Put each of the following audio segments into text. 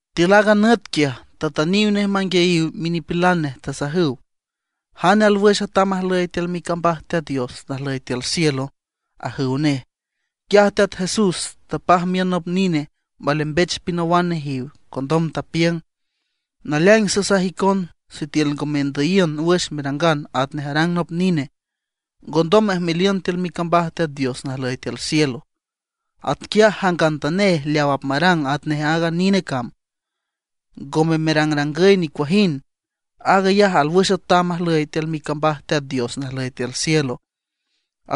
Tiül aaga nüt quiaj, tatüniw nej manguiayiw minipilan nej, tasajüw: ―¿Jane alwüx atam ajlüy tiül micambaj Teat Dios najlüy tiül cielo? ―ajüw nej. Quiaj Teat Jesús tapaj miün nop nine, malembech pinawan nejiw. Condom tapiüng: ―Naleaing sasaj icon sitiül ngo mendüyiün wüx merangan atnej arang nop nine, ngondom mejmeliün tiül micambaj Teat Dios najlüy tiül cielo. Atquiaj jangantanej leaw apmarang atnej aaga nine cam, ngo merangrangüy nicuajind, aag ayaj alwüx atam ajlüy tiül micambaj Teat Dios najlüy tiül cielo.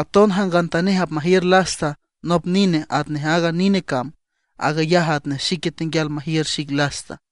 Aton jangantanej apmajiür lasta nop nine atnej aaga nine cam, aag ayaj atnej xique tenguial majiür xic lasta.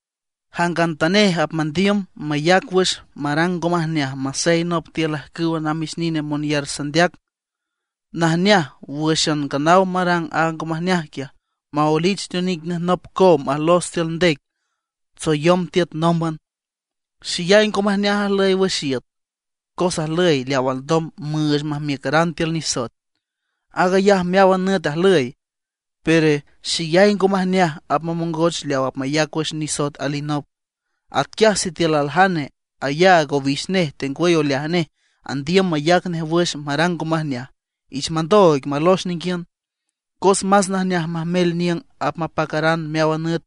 ’Jangantanej apmandiüm mayac wüx marang ngo majneaj masey nop tiül ajcüwa namix nine monyar sandeac, najneaj wǘxan nganaw marang aaga ngo majneaj quiaj, maoelich teonic nej nop cow majlos tiül ndec tsoyom tiüt nómban. ¡Xeyay ngo majneaj ajlüy wüx iüt, cos ajlüy leaw alndom müüch majmiücaran tiül nisoet! Aag ayaj meáwan nüt ajlüy, pero ¡xeyay ngo majneaj apmamongoch leaw apmayac wüx nisoet alinop! ’Atquiaj sitiül aljane ayaag owix nej tengwüy oleaj nej andiüm mayac nej wüx marang ngo majneaj, ich mandooig malox ninguiün. Cos más najneaj majmel niüng apmapacaran meáwan nüt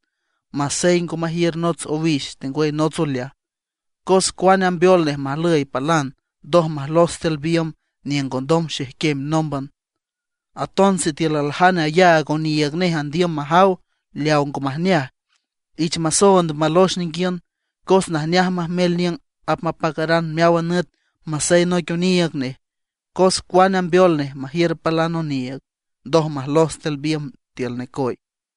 masey ngo majiür nots owix tengwüy nots oleaj, cos cuane ambeol nej majlüy palan, ndoj majlos tiül biümb niüng ngondom xejquem nómban. Aton sitiül aljane ayaag oniiüg nej andiüm majaw leaw ngo majneaj, ich masoond malox ninguiün. Cos najneaj majmel niüng apmapacaran meáwan nüt masey noic oniiüg nej, cos cuane ambeol nej majiür palan oniiüg, ndoj majlos tiül biümb tiül necoy.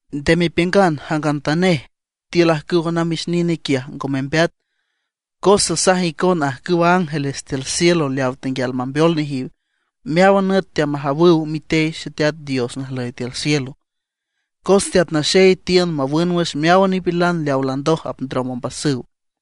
’Nde mepiüngan jangantanej tiül ajcüwa namix nine quiaj ngo membeat, cos sasaj icon ajcüwa ángeles tiül cielo leaw tenguial mambeol nejiw, meáwan nüt teamajawüw mitey Xeteat Dios najlüy tiül cielo. Cos Teat Naxey tiün mawün wüx meáwan nipilan leawa landoj apndrom ombasüw.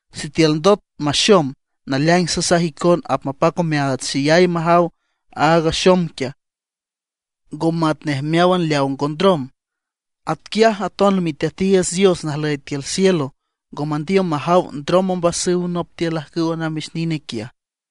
Sitiül ndot maxom, naleaing sasaj icon apmapac omeaats xeyay majaw aaga axom quiaj, ngo matnej meáwan leaw ngo ndrom. Atquiaj aton Miteatiiüts Dios najlüy tiül cielo ngo mandiüm majaw ndrom ombasüw nop tiül ajcüwa namix nine quiaj.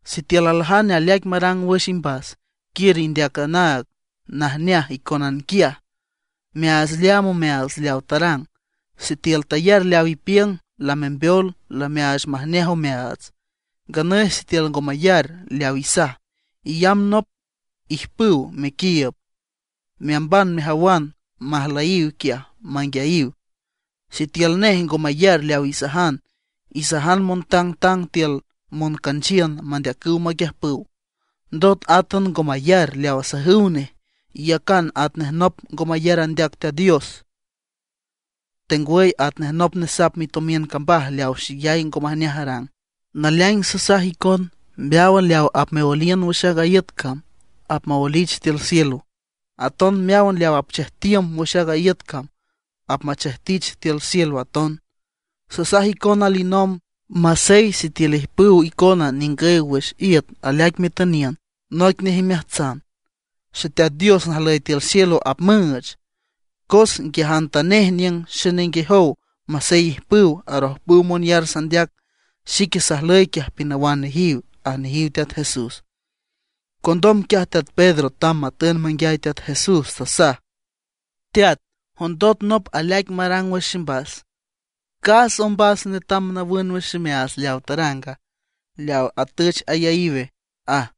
’Sitiül aljane aleaic marang wüx imbas, quiür indeac anaag najneaj icónan quiaj, meaach leaam omeaats leaw tarang. Sitiül tayar leaw ipiüng, lamembeol, lameaach majneaj omeaats. Nganüy sitiül ngo mayar leaw isaj, iyamb nop ijpüw mequiiüb, meamban mejawan majlüyiw quiaj manguiayiw. Sitiül nej ngo mayar leaw isajan, isajan montangtang tiül moncanchiün mandeacüw maquiüjpüw. Ndot átan ngo mayar leaw asajüw nej, iyacan atnej nop ngo mayar andeac Teat Dios, tengwüy atnej nop nesap mitomiün cambaj leaw xeyay ngo majneaj arang. ’Naleaing sasaj icon, meáwan leaw apmeoeliün wüx aaga iüt cam apmaoelich tiül cielo. Aton meáwan leaw apmechejtiün wüx aaga iüt cam, apmachejtich tiül cielo aton. ’Sasaj icon alinomb, masey sitiül ijpüw icona ningüy wüx iüt aleaic metüniün, noic nej imeajtsan, Xeteat Dios najlüy tiül cielo apmüüch. Cos nguiajantanej niüng xenenguejow masey ijpüw arojpüw monyar sandeac, xique sajlüy quiaj pinawan nejiw ―aj nejiw Teat Jesús. Condom quiaj teat Pedro tamb matün manguiay Teat Jesús, tasaj: ―Teat, ¿jondot nop aleaic marang wüx ximbas, cas ombas netam nawün wüx ximeaats leawa taranga, leaw atüch ayaíwe? ―aj.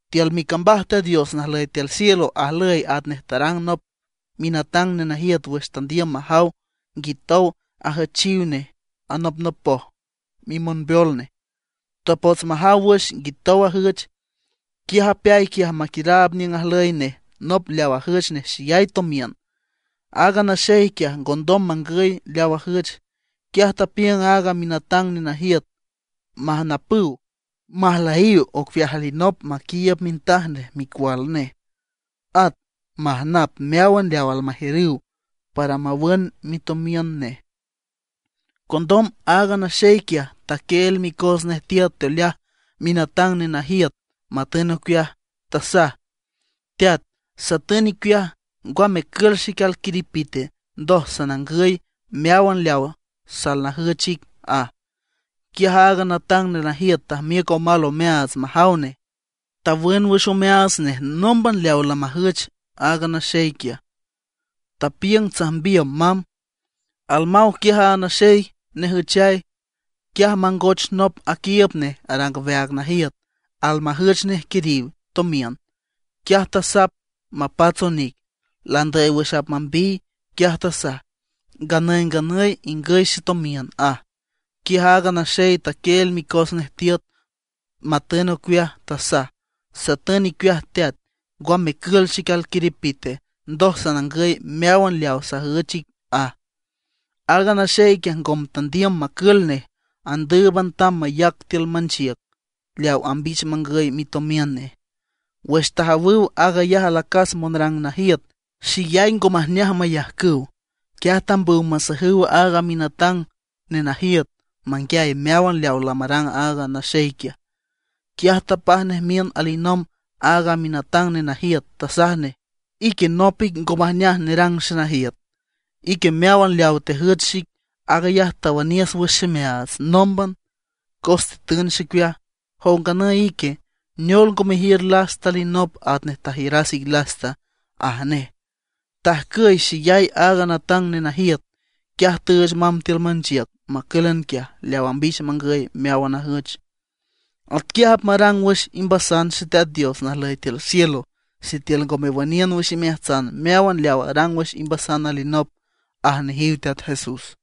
’Tiül micambaj Teat Dios najlüy tiül cielo ajlüy atnej tarang nop minatang nenajiüt wüx tandiüm majaw nguitow ajüchiw nej anopnopoj mimonbeol nej. Tapots majaw wüx nguitow ajüch, quiaj apeay quiaj maquiüraab niüng ajlüy nej nop leaw ajüch nej xeyay tomiün. Aaga naxey quiaj ngondom mangüy leaw ajüch. Quiaj tapiüng aaga minatang nenajiüt majnapüw, majlüyiw ocueaj alinop maquiiüb mintaj nej micual nej. At majnap meáwan leaw almajiürüw para mawün mitomiün nej. Condom aaga naxey quiaj taquieel micos nej tiüt teoleaj minatang nenajiüt matün ocueaj. Tasaj: “Teat, satün icueaj, ngwa mecül xic alquiripite, ndoj sanangüy meáwan leaw salnajüch ic”, aj. Quiaj aaga natang nenajiüt tajmiüc omal omeaats majaw nej. Tawün wüx omeaats nej nómban leaw lamajüch aaga naxey quiaj, tapiüng tsajmbiüm mamb. Almaw quiaj aaga naxey nejüchay, quiaj mangoch nop aquiiüb nej arang aweaag najiüt, almajüch nej quiriw tomiün. Quiaj tasap mapats onic, landüy wüx apmambiy. Quiaj tasaj: “Nganüy nganüy ingüy xetomiün”, aj. Quiaj aaga naxey taquieel micos nej tiüt, matün ocueaj, tasaj: “Satün icueaj teat, ngwa mecül xic alquiripite, ndoj sanangüy meáwan leaw sajüch ic”, aj. Aaga naxey quiaj ngome tandiüm macül nej, andǘüban tamb mayac tiül manchiüc leaw ambich mangüy mitomiün nej. Wüx tajawüw aag ayaj alacas monrang najiüt, xeyay ngo majneaj mayajcüw. Quiaj tambüw masajüw aaga minatang nenajiüt manguiay meáwan leaw lamarang aag naxey quiaj. Quiaj tapaj nej miün alinomb aaga minatang nenajiüt, tasaj nej: “¡Ique nop ic ngo majneaj nerang xenajiüt! Ique meáwan leaw tejüch xic, aag ayaj tawüniüs wüx ximeaats nómban, cos tetün xicueaj. Jow nganüy ique, ¿neol ngo mejiür lasta alinop atnej tajiüras ic lasta?” aj nej. Tajcüy xeyay aaga natang nenajiüt, quiaj tüüch mamb tiül manchiüc macǘlan quiaj leaw ambich mangüy meáwan ajüch. ’Atquiaj apmarang wüx imbasan Xeteat Dios najlüy tiül cielo sitiül ngo mewüniün wüx imeajtsan meáwan leaw arang wüx imbasan alinop ―aj nejiw Teat Jesús.